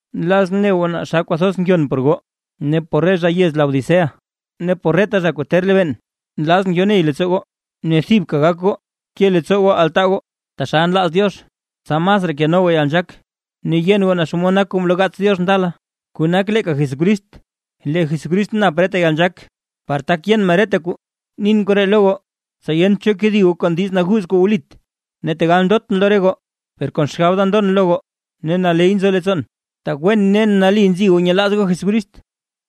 Nlazʼn ne goo naa xa kwathoz ngyon por goo, ne por re zha yez Laodicea, ne por reta zha kuu ter lebeen. Nlazʼn yo ney leettsoo goo ne thibka gak goo ke leettsoo goo altaa goo taxal nlaaz Diox, tsa masraa keno goo yalnzhaak ne yen goo naa xomod nak kuu mloo gaats Diox ndala, kuu nak leeka Jesucrist; lee Jesucrist nap reta yalnzhaak par tak yen men reta kuu. Nin koree lo goo, tsa yent cho kedi goo kon diiz naguuz kuu wlit. Ne tegal ndotʼn lo re goo, per kon xgab da ndon lo goo ne naley nzo leettsoon, tak wen ne nali nzi goo nyelaaz goo Jesucrist.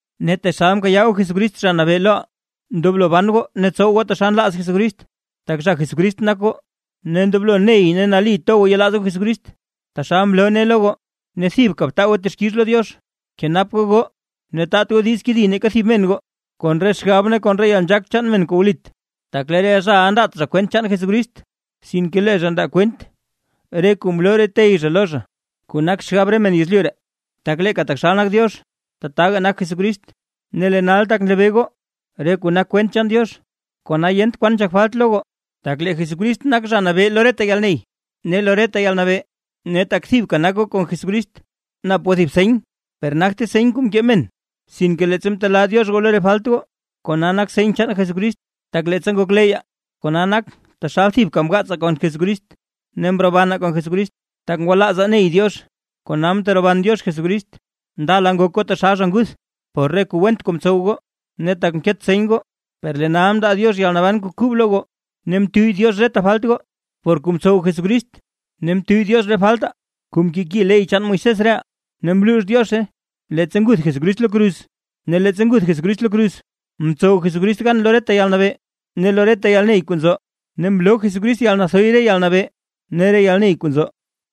Ne taxal mkayaa goo Jesucrist, Zha Nabee loʼaa, ndoblo ban goo ne tsow goo taxal nlaaz Jesucrist, tak zha Jesucrist nak goo, ne ndoblo ney ne nali to goo yelaaz goo Jesucrist, taxal mloo nee lo goo ne thibka btaa goo texkix lo Diox. Kenap goo goo, ne taat goo diiz kedi neeka thib men goo kon re xgab ne kon yalnzhaak chaan re men kuu wlit, tak lee re zhaʼa ndaat zha kwent chaan Jesucrist, sinke lee zha ndaa kwent re kuu mloo re tey zha lo zha, kuu nak xgab re men yezlyu ree. Tak leeka taxal nak Diox, tataga nak Jesucrist. Ne lee nal tak nlebee goo re kuu nak kwent chaan Diox, kona yent kwan nzhak falt lo goo, tak lee Jesucrist nak Zha Nabee lo reta yalney ne lo reta yalnabee. Ne tak thibka nak goo kon Jesucrist, nap goo thib seny, per nagte seny kuu mkee men, sinke leettsa mtelaa Diox goo lo re falt goo, kona nak seny chaan Jesucrist, tak leettsa ngokleyyaa, kona nak taxal thibka mgaatsaa kon Jesucrist, ne mrobanaa kon Jesucrist, tak ngwalaazaa ney Diox, kona mteroban Diox Jesucrist. Ndala ngok goo taxal zha nguth, por re kuu went kuu mtsow goo ne tak mket seny goo; per lee nal mndaa Diox yalnaban kuu kub lo goo, ne mtuyy Diox reta falt goo, por kuu mtsow Jesucrist. Ne mtuyy Diox re faltaa kuu mkeki ley chaan Moisés reʼaa; ne mluux Diozhe leettsa nguth Jesucrist lo kruz. Ne leettsa nguth Jesucrist lo kruz, mtsow Jesucrist gan lo reta yalnabee ne lo reta yalney kuu nzo, ne mloo Jesucrist yalnathoy re yalnabee ne re yalney kuu nzo.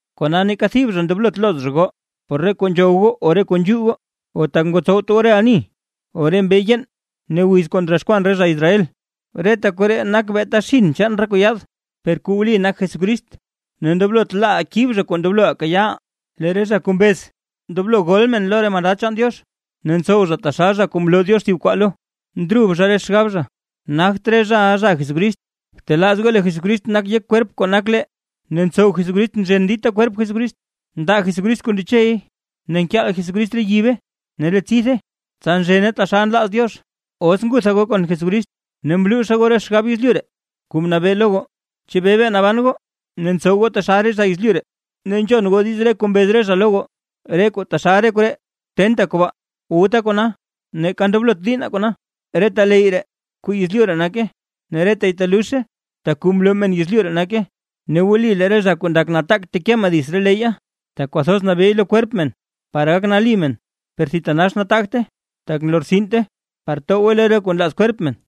Kona neeka thib zha ndoblot looz zha goo por re kuu nzhow goo o por kuu nzhuu goo, o tak ngotsowt goo re ani, o re mbee yeen, ne wiz kuu ndroxkwan re zha Israel. Reta koree nak beeta xinn chaan re kuu yaad, per kuu wli nak Jesucrist. Ne ndoblot laaʼaa kib zha kuu ndobloʼaa kayaaʼaa. Lee re zha kuu mbez ndoblo gol men lo re mandad chaan Diox. Ne ntsow zha taxal zha kuu mloo Diox thib kwaa lo, ndrub zha re xgab zha. Nagt re zhaʼa zha Jesucrist. Btelaaz goo lee Jesucrist nak yek kwerp kuu nak lee, ne ntsow Jesucrist nzhen dita kwerp Jesucrist, ndaa Jesucrist kuu ndechey ne nkyel Jesucrist re yibe ne re tsithe tsa nzhene taxal nlaaz Diox. Os ngutha goo kon Jesucrist ne mluuzha goo re xgab yezlyu ree kuu mnabee lo goo. ¿Chebee bee naban goo ne ntsow goo taxal zha yezlyu ree, ne nzhon goo diiz re kuu mbez re zha lo goo, re kuu taxal re koree: “Tenta kobaa, wuta kona, neeka ndoblot diinna kona”? Reta leyy ree kuu yezlyu ree nake, ne retay teluzhe, tak kuu mloo men yezlyu ree nake. Ne wli lee re zha ndak nataak teke men dits re leyya, tak kwathoz nabeey lo kwerp men par gak nali men, per thitanax nataagte, tak lortsinte, par towgwe lo re kuu nlaaz kwerp men.